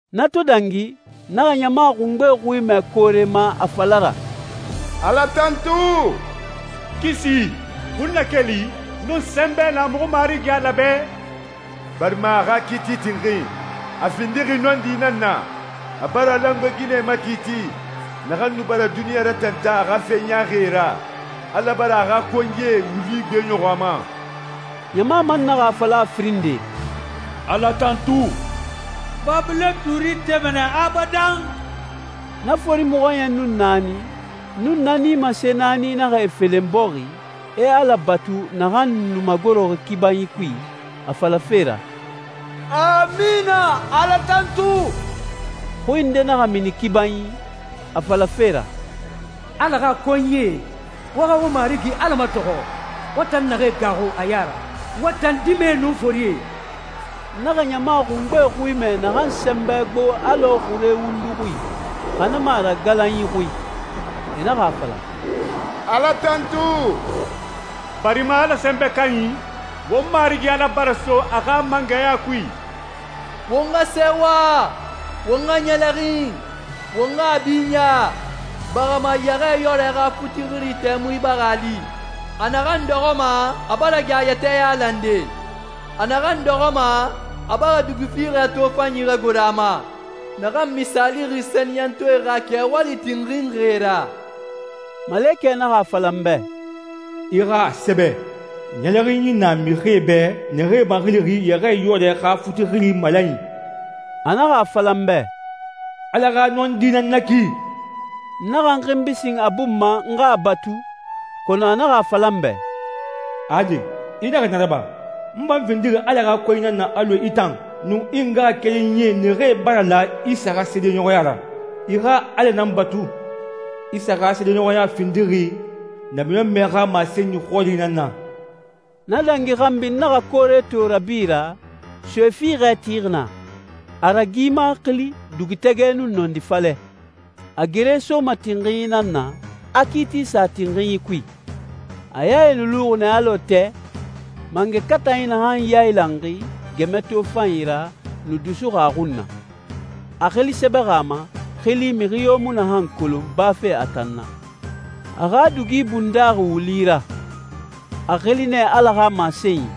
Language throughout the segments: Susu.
Na to dangi, n naxa ɲama xungbe xui mɛ koore ma a fala ra, «Ala tantu. Kisi, xunnakeli, nun sɛnbɛ na muxu Marigi Ala bɛ, barima a xa kiiti tinxin, a findixi nɔndi nan na. A bara langoe ginɛ makiiti, naxan nu bara duniɲa ratantan a xa fe ɲaaxie ra. Ala bara a xa konyie wuli gbeɲɔxɔ a ma.» Ɲama man naxa a fala a firin nde, «Ala tantu. Babilɔn tuuri tema nɛ abadan.» Na fori mɔxɔɲɛn nun naani, nun na nimase naani naxa e felen bɔxi, e Ala batu naxan nu magoroxi kibanyi kui, a falafe ra, «Amina, Ala tantu.» Xui nde naxa mini kibanyi, a falafe ra, «Ala xa konyie, wo xa won Marigi Ala matɔxɔ, wo tan naxee gaaxu a ya ra, wo tan dimɛe nun forie.» N naxa ɲama xungbe xui mɛ naxan sɛnbɛ gbo alɔ xure wundu xui, xa na mu a ra galanyi xui. E naxa a fala, «Ala tantu, barima Ala Sɛnbɛ Kanyi, won Marigi Ala bara so a xa mangɛya kui. Won xa sɛɛwa, won xa ɲɛlɛxin, won xa a binya, barima Yɛxɛɛyɔrɛ xa futi xiri tɛmui bara a li. A naxan dɔxɔma, a bara gɛ a yɛtɛ yailande. A naxan dɔxɔma a bara dugi fiixɛ tofanyi ragoro a ma, naxan misaalixi sɛniyɛntɔɛe xa kɛwali tinxinxie ra.» Malekɛ naxa a fala n bɛ, «I xa a sɛbɛ, ‹Ɲɛlɛxinyi na mixie bɛ naxee maxilixi Yɛxɛɛyɔrɛ xa futi xiri malanyi.›» A naxa a fala n bɛ, «Ala xa nɔndi nan na ki.» N naxa n xinbi sin a bun ma n xa a batu, kɔnɔ a naxa a fala n bɛ, «Ade, i naxa na raba. N fan findixi Ala xa konyi nan na alɔ i tan nun i ngaxakerenyi naxee bara la Isa xa seedeɲɔxɔya ra. I xa Ala nan batu. Isa xa seedeɲɔxɔya findixi namiɲɔnmɛ xa masenyi xɔri nan na.» Na dangi xanbi n naxa koore to rabi ra, soe fiixɛ tixi na, a ragima xili Dugutɛgɛ nun Nɔndi falɛ. A gere soma tinxinyi nan na, a kiiti sa tinxinyi kui. A yae nu luxi nɛ alɔ tɛ, mangɛ katanyi naxan yailanxi gɛmɛ tofanyi ra nu dusuxi a xun na. A xili sɛbɛxi a ma, xili mixi yo mu naxan kolon bafe a tan na. A xa dugi bundaxi wuli ra. A xili nɛ Ala xa Masenyi.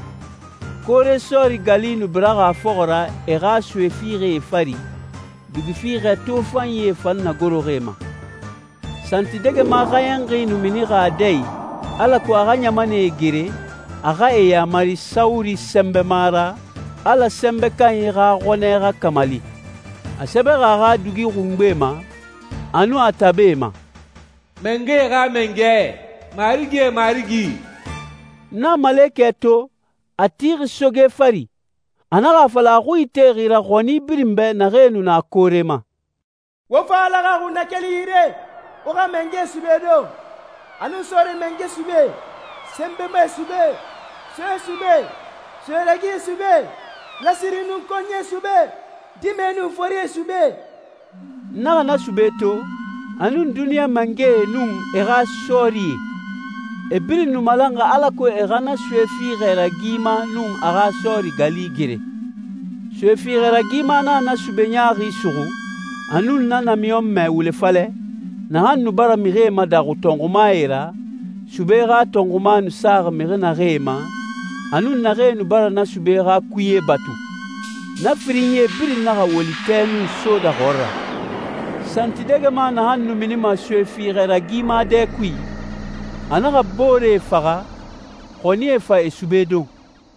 Koore sɔɔri gali nu biraxi a fɔxɔ ra e xa soe fiixɛe fari, dugi fiixɛ tofanyie fan nagoroxi e ma. Santidɛgɛma xɛɲɛnxi nu minixi a dɛ i, alako a xa ɲamanɛe gere, a xa e yamari sawuri sɛnbɛma ra, Ala Sɛnbɛ Kanyi xa xɔnɛ xa kamali. A sɛbɛxi a xa dugi xungbe ma, a nun a tabe ma, «Mangɛe xa Mangɛ, marigie Marigi.» N naxa malekɛ to, a tixi soge fari. A naxa a fala a xui itexi ra xɔni birin bɛ naxee nu na koore ma, «Wo fa Ala xa xunnakeli yire, wo xa mangɛe sube don, a nun sɔɔri mangɛe sube, sɛnbɛmae sube, soee sube, soe ragie sube, lasiri nun konyie sube, dimɛe nun forie sube.» N naxa na sube to, a nun duniɲa mangɛe nun e xa sɔɔrie. E birin nu malanxi alako e xa na soe fiixɛ ragima nun a xa sɔɔri gali gere. Soe fiixɛ ragima naxa na sube ɲaaxi suxu, a nun na namiɲɔnmɛ wule falɛ, naxan nu bara mixie madaxu tɔnxumae ra, sube xa tɔnxuma nu saxi mixi naxee ma, a nun naxee nu bara na sube xa kuye batu. Na firinyie birin naxa woli tɛ nun soda xɔɔra. Santidɛgɛma naxan nu minima soe fiixɛ ragima dɛ kui, a naxa booree faxa, xɔnie fa e sube don.